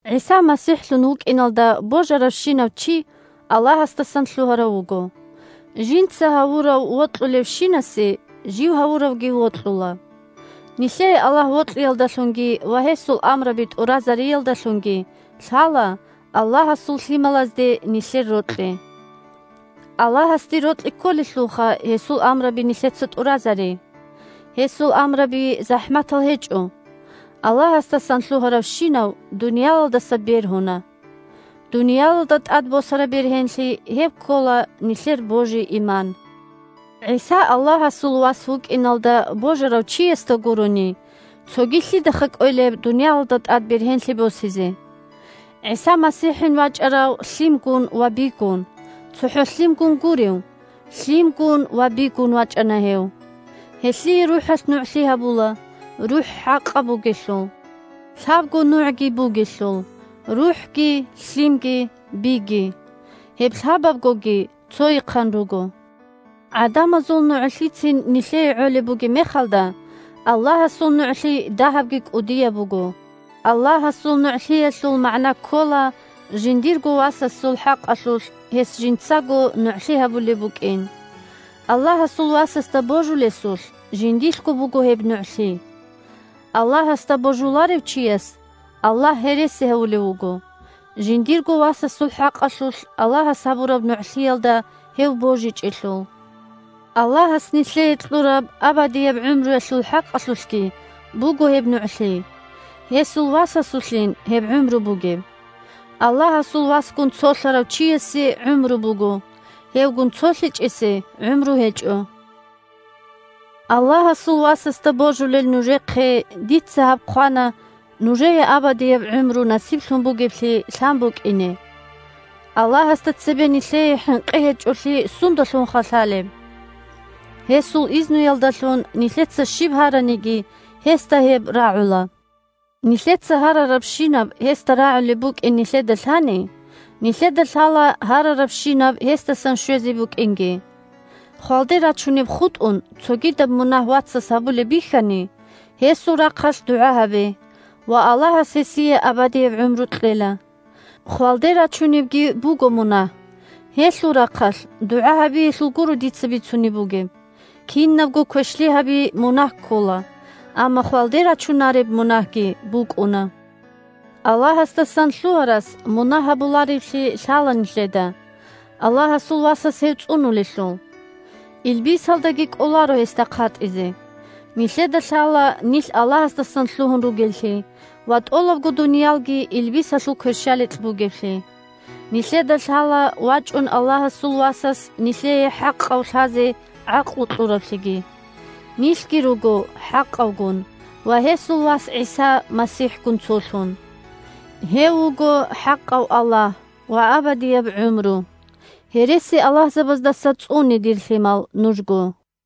ГӀиса МасихӀлъун вукӀиналда божаравщинав чи Аллагьасдасан лъугьарав вуго. Жинца гьавурав вокьулевщинасе жив гьавуравги вокьула. Нилъее Аллагь вокьиялдалъунги ва гьесул амраби тӀуразариялдалъунги лъала Аллагьасул лъималазде нилъер рокьи. Аллагьасде рокьи кколелъулха гьесул амраби нилъеца тӀуразари. Гьесул амраби захӀматал гьечӀо. Аллагьасдасан лъугьаравщинав дуниялалдаса бергьуна! Дуниялалда тӀад босараб бергьенлъи – гьеб ккола нилъер божи-иман. ГӀиса Аллагьасул Вас вукӀиналда божарав чиясда гурони, цоги лъидаха кӀвелеб дуниялалда тӀад бергьенлъи босизе! ГӀиса МасихӀин вачӀарав лъимгун ва бигун, цохӀо лъимгун гурев, лъимгун ва бигун вачӀана гьев. Гьелъие РухӀалъ нугӀлъи гьабула, РухӀ хӀакъаб бугелъул. Лъабго нугӀги бугелъул: РухӀги, лъимги, биги. Гьеб лъабабгоги цойихъан руго. ГӀадамазул нугӀлъицин нилъее гӀолеб бугеб мехалда, Аллагьасул нугӀлъи дагьабги кӀудияб буго. Аллагьасул нугӀлъиялъул магӀна ккола жиндирго Васасул хӀакъалъулъ гьес жинцаго нугӀлъи гьабулеб букӀин. Аллагьасул Васасда божулесулъ жиндилъго буго гьеб нугӀлъи. Аллагьасда божуларев чияс Аллагь гьереси гьавулев вуго, жиндирго Васасул хӀакъалъулъ Аллагьас гьабураб нугӀлъиялда гьев божичӀелъул. Аллагьас нилъее кьураб абадияб гӀумруялъул хӀакъалъулъги буго гьеб нугӀлъи. Гьесул Васасулъин гьеб гӀумру бугеб. Аллагьасул Васгун цолъарав чиясе гӀумру буго, гьевгун цолъичӀесе гӀумру гьечӀо. Аллагьасул Васасда божулел нужехъе дица гьаб хъвана нужее абадияб гӀумру насиблъун бугеблъи лъан букӀине. Аллагьасда цебе нилъее хӀинкъи гьечӀолъи сундалъунха лъалеб? Гьесул изнуялдалъун нилъеца щиб гьараниги, гьесда гьеб рагӀула. Нилъеца гьарарабщинаб гьесда рагӀулеб букӀин нилъеда лъани, нилъеда лъала гьарарабщинаб гьесдасан щвезе букӀинги. Хвалде рачунеб хутӀун, цогидаб мунагь вацас гьабулеб бихьани, гьесул рахъалъ дугӀа гьабе, ва Аллагьас гьесие абадияб гӀумру кьела. (Хвалде рачунебги буго мунагь; гьелъул рахъалъ дугӀа гьабиялъул гуро дица бицунеб бугеб. Кинабго квешлъи гьаби мунагь ккола, амма хвалде рачунареб мунагьги букӀуна.) Аллагьасдасан лъугьарас мунагь гьабулареблъи лъала нилъеда, Аллагьасул васас гьев цӀунулелъул! Илбисалдаги кӀоларо гьесда хъатӀизе. Нилъеда лъала нилъ Аллагьасдасан лъугьун ругеллъи ва тӀолабго дуниялги илбисалъул кверщаликь бугеблъи. Нилъеда лъала вачӀун Аллагьасул Васас нилъее ХӀакъав лъазе гӀакълу кьураблъиги. Нилъги руго ХӀакъавгун ва гьесул Вас ГӀиса МасихӀгун цолъун. Гьев вуго хӀакъав Аллагь ва абадияб гӀумру. Гьересиаллагьзабаздаса цӀуне, дир лъимал, нужго!